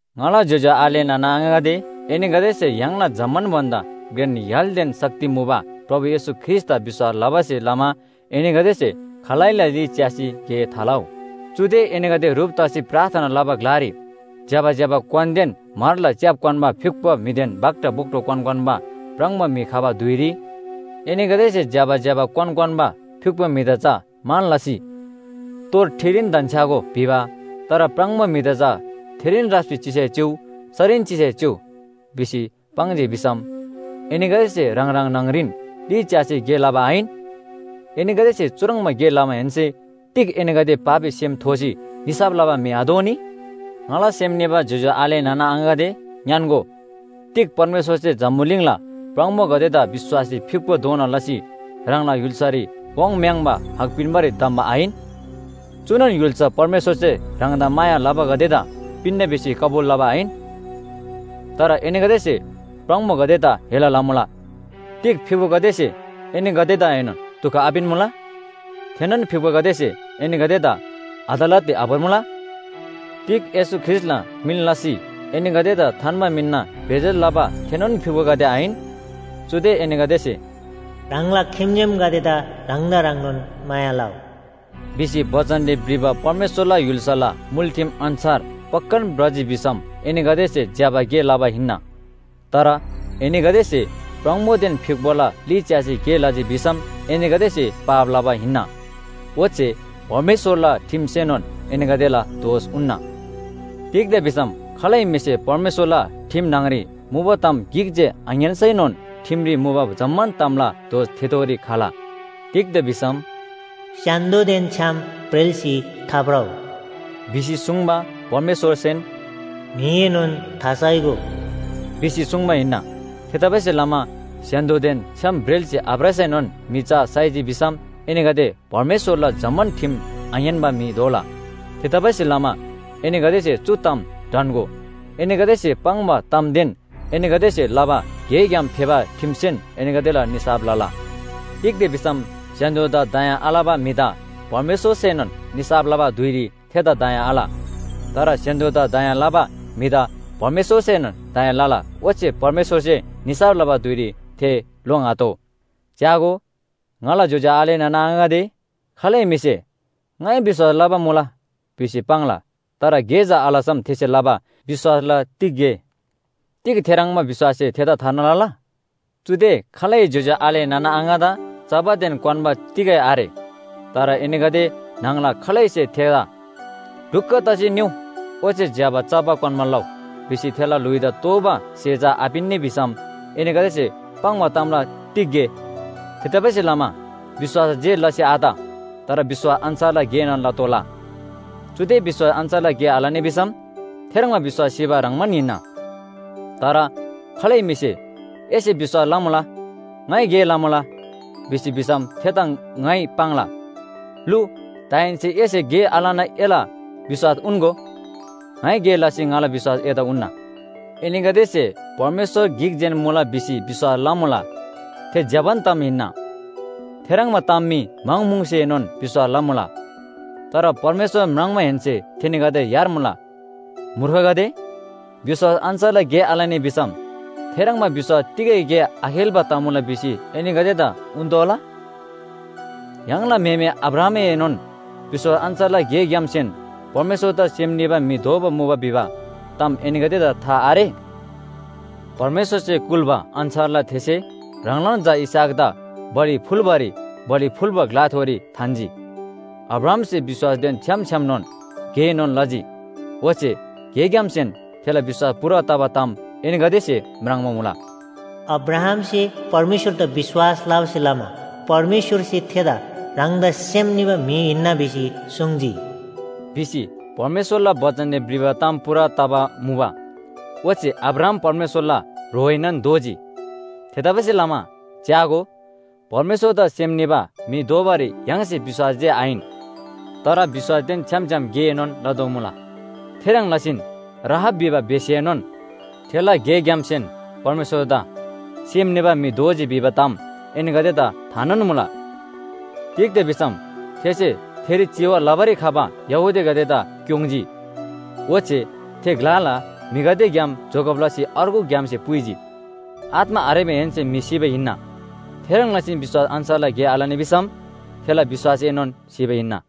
ङाला ज्‍योज्‍यो आले नाना आङागदे, एनीगदेसे य्‍हाङला जम्‍मान भन्‍दा घ्रेन य्‍हालदेन शक्ति मुबा प्रभु येशू ख्रीष्‍टदा विश्‍वास लबासे लमा एनीगदेसे खालैला ली च्‍यासी गे थालउ। चुदे एनीगदे ह्रुप तसी प्रार्थना लबा ग्‍लारी ज्‍यबा ज्‍यबा क्‍वानदेन म्‍हरला च्‍याप क्‍वान्‍बा फ्‍युक्‍पो म्‍हिदेन भाक्‍टा भोक्‍टो क्‍वान क्‍वान्‍बा प्राङबो म्‍हि खबा धुइरी एनीगदेसे ज्‍यबा ज्‍यबा क्‍वान क्‍वान्‍बा फ्‍युक्‍पो म्‍हिदा चा मान लसी, “तोर ठिरीन धन्‍छ्‌यागो” भिबा, तर प्राङबो म्‍हिदा चा “थेरीन राप्‍सी चिसै चिउ, सरीन चिसै चिउ” भिसी पाङ्जी भिसम, एनीगदेसे ह्राङ ह्राङ न्‍हङरीन ली च्‍यासी गे लबा आहिन? एनीगदेसे चुह्रङ्बा गे लमाहेन्‍से तिग एनीगदे पापी सेम थोसी निसाफ लबा म्‍हि आदोनी? ङाला सेम निबा ज्‍योज्‍यो आले नाना आङागदे ङ्‌यान्‍गो, तिग परमेश्‍वरसे जम्‍बुलिङला प्राङबोगदेदा विश्‍वासरी फ्‍युक्‍पो दोना लसी ह्राङला य्‍हुल्‍सारी वाङ्म्‍याङ्बा हक पिन्‍बारी धम्‍बा आहिन? चुनोन य्‍हुल्‍सा परमेश्‍वरसे ह्राङदा माया लबागदेदा पिन्‍ना भिसी कबुल लबा आहिन? तर एनीगदेसे प्राङबोगदेदा हेला लमुला। तिग फ्‍युक्‍पोगदेसे एनीगदेदाएनोन दुख आपिन्‍मुला? थेनोन फ्‍युक्‍पोगदेसे एनीगदेदा अदालतरी आभोर्मुला? तिग येशू ख्रीष्‍टला मिन लसी एनीगदेदा थान्‍बा मिनना बेइज्‍जत लबा थेनोन फ्‍युक्‍पोगदे आहिन? चुदे एनीगदेसे “ह्राङला खिम्‍जेमगदेदा ह्राङदा ह्रङ्नोन माया लउ” भिसी बचनरी भ्रिबा परमेश्‍वरला य्‍हुल्‍साला मुल ठिम अन्‍छार पक्‍कान भ्रजी भिसम एनीगदेसे ज्‍यबा गे लबा हिन्‍ना। तर एनीगदेसे प्राङबोदेन फ्‍युक्‍पोला ली च्‍यासी गे लजी भिसम एनीगदेसे पाप लबा हिन्‍ना। ओच्‍छे परमेश्‍वरला ठिमसेनोन एनीगदेला दोष उन्‍ना। तिग्‍दा भिसम खालै म्‍हिसे परमेश्‍वरला ठिम न्‍हङरी मुबा ताम गिक जे आङ्‌यान्‍सैनोन ठिमरी मुबा जम्‍मान तामला दोष थेथोरी खला। तिग्‍दा भिसम “स्‍य्‍हान्‍दोदेन छ्‌याम ब्रेल्‍सी थाभ्रउ” भिसी सुङ्बा परमेश्‍वरसेन “म्‍हिएनोन थासाइगो” भिसी सुङ्बा हिन्‍ना। थेतबासेलमा स्‍य्‍हान्‍दोदेन छ्‌याम ब्रेल्‍सी आभ्रसैनोन म्‍हि चा साइजी भिसम एनीगदे परमेश्‍वरला जम्‍मान ठिम आङ्‌यान्‍बा म्‍हि दोला। थेतबासेलमा एनीगदेसे चु ताम ढन्‍गो, एनीगदेसे पाङ्बा तामदेन एनीगदेसे लबा गेग्‍याम फेबा ठिमसेन एनीगदेला निसाफ लला। तिग्‍दा भिसम स्‍य्‍हान्‍दोदा दया आलबा म्‍हिदा परमेश्‍वरसेनोन निसाफ लबा धुइरी थेदा दया आल। तर स्‍य्‍हान्‍दोदा दया लबा म्‍हिदा परमेश्‍वरसेनोन दया लला ओच्‍छे परमेश्‍वरसे निसाफ लबा धुइरी थे लोङ्आतोः। च्‍यागो, ङाला ज्‍योज्‍यो आले नाना आङागदे, खालै म्‍हिसे “ङाइ विश्‍वास लबा मुला” भिसी पाङ्ला, तर गे चा आलसम थेसे लबा विश्‍वासला तिग गे? तिग थेह्रङ्बा विश्‍वाससे थेदा थार्ना लला? चुदे खालै ज्‍योज्‍यो आले नाना आङादा चबादेन क्‍वान्‍बा तिगै आरे। तर एनीगदे न्‍हङला खालैसे थेदा “ढुक्‍क तसी निउ ओच्‍छे ज्‍यबा चबा क्‍वान्‍बा लउ” भिसी थेला ल्‍हुइदा तोःबा स्‍हे चा आपिन्‍नी भिसम एनीगदेसे पाङ्बा तामला तिग गे? थेतबासेलमा विश्‍वास जे लसी आत। तर विश्‍वास अन्‍छारला गेएनोन लतोःला। चुदे विश्‍वास अन्‍छार गे आलनी भिसम थेह्रङ्बा विश्‍वास सिबा ह्रङ्‌बान हिन्‍ना। तर खालै म्‍हिसे “एसे विश्‍वास लमुला, ङाइ गे लमुला” भिजी भिसम थेदा ङाइ पाङ्ला, “लु, दाहेन्‍से एसे गे आलना एला विश्‍वास उन्‍गो। ङाइ गे लसी ङाला विश्‍वास एदा उन्‍ना।” एनीगदेसे परमेश्‍वर गिक जेन मुला भिसी विश्‍वास लमुला। थे ज्‍यबान ताम हिन्‍ना। थेह्रङ्बा ताम मी म्‍हङ म्‍हुङसेनोन विश्‍वास लमुला। तर परमेश्‍वर म्राङ्माहेन्‍से थेनीगदे यार्मुला। मूर्खगदे, विश्‍वास अन्‍छारला गे आलनी भिसम थेह्रङ्बा विश्‍वास तिगै गे आखेल्‍बा तमुला भिसी एनीगदेदा उन्‍तोःला? य्‍हाङला म्‍हेमे अब्राहामएनोन विश्‍वास अन्‍छारला गेग्‍यामसेन परमेश्‍वरदा सेम निबा म्‍हि दोबा मुबा भिबा ताम एनीगदेदा था आरे? परमेश्‍वरसे कुल्‍बा अन्‍छारला थेसे ह्राङलान झा इसहाकदा बलि फुल्‍बारी बलि फुल्‍बा ग्‍लाथोरी थान्‍जी। अब्राहामसे विश्‍वासदेन छ्‌याम छ्‌यामनोन गेएनोन लजी। ओच्‍छे गेग्‍यामसेन थेला विश्‍वास पूरा तबा ताम एनीगदेसे म्राङ्बा मुला। “अब्राहामसे परमेश्‍वरदा विश्‍वास लबासे लमा परमेश्‍वरसे थेदा ह्राङदा सेम निबा म्‍हि हिन्‍ना भिसी सुङ्जी” भिसी परमेश्‍वरला बचनरी भ्रिबा ताम पूरा तबा मुबा। ओच्‍छे अब्राहाम परमेश्‍वरला ह्रोएनोन दोजी। थेतबासेलमा च्‍यागो, परमेश्‍वरदा सेम निबा म्‍हि दोबारी य्‍हाङसे विश्‍वास जे आहिन, तर विश्‍वासदेन छ्‌याम छ्‌याम गेएनोन लदोमुला। थेह्रङ् लसीन राहाब भिबा बेश्‍याएनोन थेला गेग्‍यामसेन परमेश्‍वरदा सेम निबा म्‍हि दोजी भिबा ताम एनीगदेदा थानोन मुला। तिग्‍दा भिसम थेसे थेरी चिवा लबारी खबा यहूदीगदेदा क्‍योङ्‌जी। ओच्‍छे थे ग्‍लाला म्‍हिगदेग्‍याम जोगब लसी अर्गु ग्‍यामसे पुइजी। आत्‍मा आरेमाहेन्‍से म्‍हि सिबा हिन्‍ना, थेह्रङ् लसीन विश्‍वास अन्‍छारला गे आलनी भिसम थेला विश्‍वासएनोन सिबा हिन्‍ना।